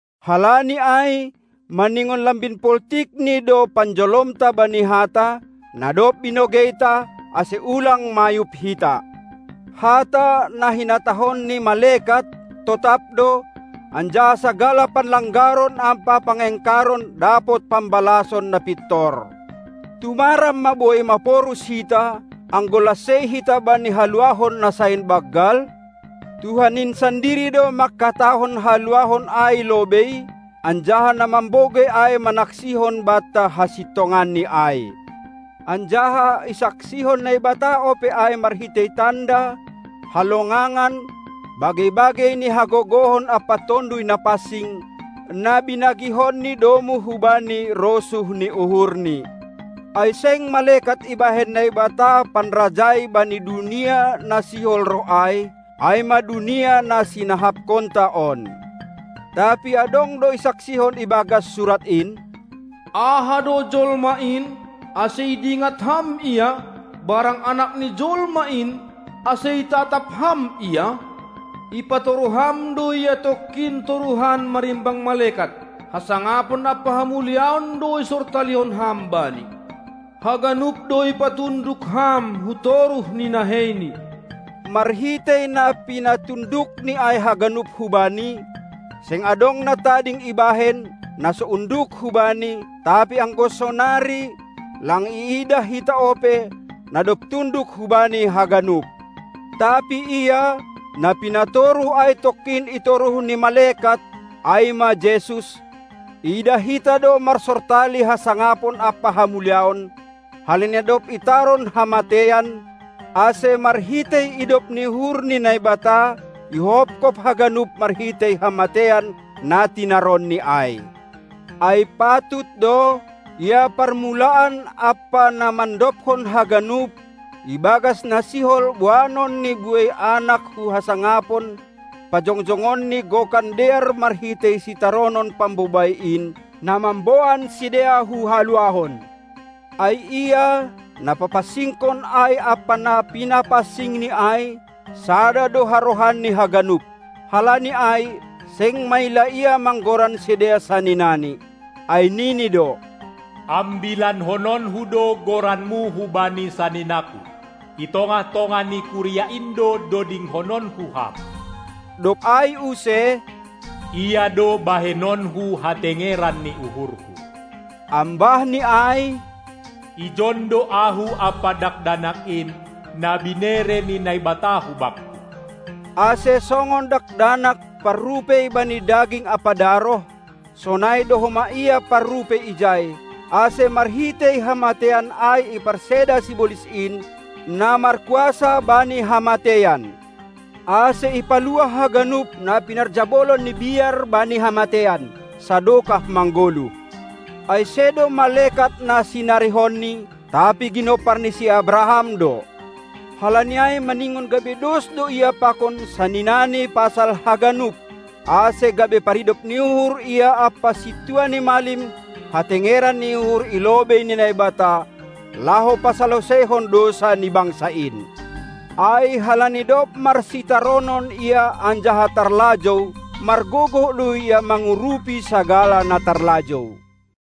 Halani ai, maningon lambin poltikni do panjolomta bani hata, na dob binogeita, ase ulang mayub hita. Hata, na hinatahon ni malekat, totap do, anjaha sagala panlanggaron ampa pangengkaron dapot pambalason na pintor. Tumaram ma boi maporus hita, anggo lansei hita bani haluahon na sain banggal? Tuhan in sandiri do manghatahon haluahon ai lobei, anjaha na mambogei ai manaksihon banta hasintonganni ai, anjaha isaksihon Naibata ope ai marhitei tanda, halongangan, bagei-bagei ni hagogohon ampa Tonduy Napansing, na binagihonNi domu hubani rosuh ni uhurNi. Ai seng malekat ibahen Naibata panrajai bani dunia na sihol roh ai, ai ma dunia na sinahapkonta on. Tapi adong do isaksihon ibagas Surat in: Aha do jolma in, ase idingat Ham ia, barang anak ni jolma in, ase itatap Ham ia? Ipatoruh Ham do ia tongkin toruhan marimbang malekat; hasangapon ampa hamuliaon do isortalihon Ham bani. Haganup do ipatunduk Ham hutoruh ni naheiNi. Marhitei na pinatundukni ai haganup hu Bani, seng adong na tading ibahen, na so unduk hu Bani; tapi anggo sonari, lang iidah hita ope, na dob tunduk hu Bani haganup. Tapi Ia, na pinatoruh ai tongkin itoruh ni malekat, ai ma Jesus, iidah hita do marsortali hasangapon ampa hamuliaon, halani na dob itaron hamateian, ase marhitei idop ni uhur ni Naibata ihophop haganup marhitei hamateian na tinaronNi ai, Ai patut do, Ia parmulaan ampa na mandobhon haganup, ibagas na sihol boanonNi buei anak hu hasangapon, pajongjongonNi gokan dear marhitei sitaronon pambobai in, na mamboan sidea hu haluahon. Ai Ia, na papansingkon ai ampa na pinapansingNi ai, sada do harohanni haganup. Halani ai, seng maila Ia manggoran sidea saninaNi, ai nini do: Ambilanhononku do goranMu hubani saninangKu; i tongah-tongah ni kuria in do dodinghononku Ham. Dob ai use: "Ia do bahenonku hatengeran ni uhurhu". Ambah ni ai: "Ijon do Ahu ampa dakdanak in, na binere ni Naibata hu Bakku". Ase, songon dakdanak parrupei bani daging ampa daroh, sonai do homa Ia parrupei ijai, ase marhitei hamateian ai iparseda sibolis in, na markuasa bani hamateian, ase ipaluah haganup na pinarjabolon ni biar bani hamateian, sadokah manggoluh. Ai sedo malekat na sinarihonni, tapi ginompar ni si Abraham do. Halani ai maningon gabe dos do Ia pakon saninaNi pasal haganup, ase gabe paridop ni uhur Ia ampa Sintua ni malim hatengeran ni uhur i lobei ni Naibata, laho pasaloseihon dousa ni bangsa in. Ai, halani dob marsitaronon Ia anjaha tarlajou, margogoh do Ia mangurupi sagala na tarlajou.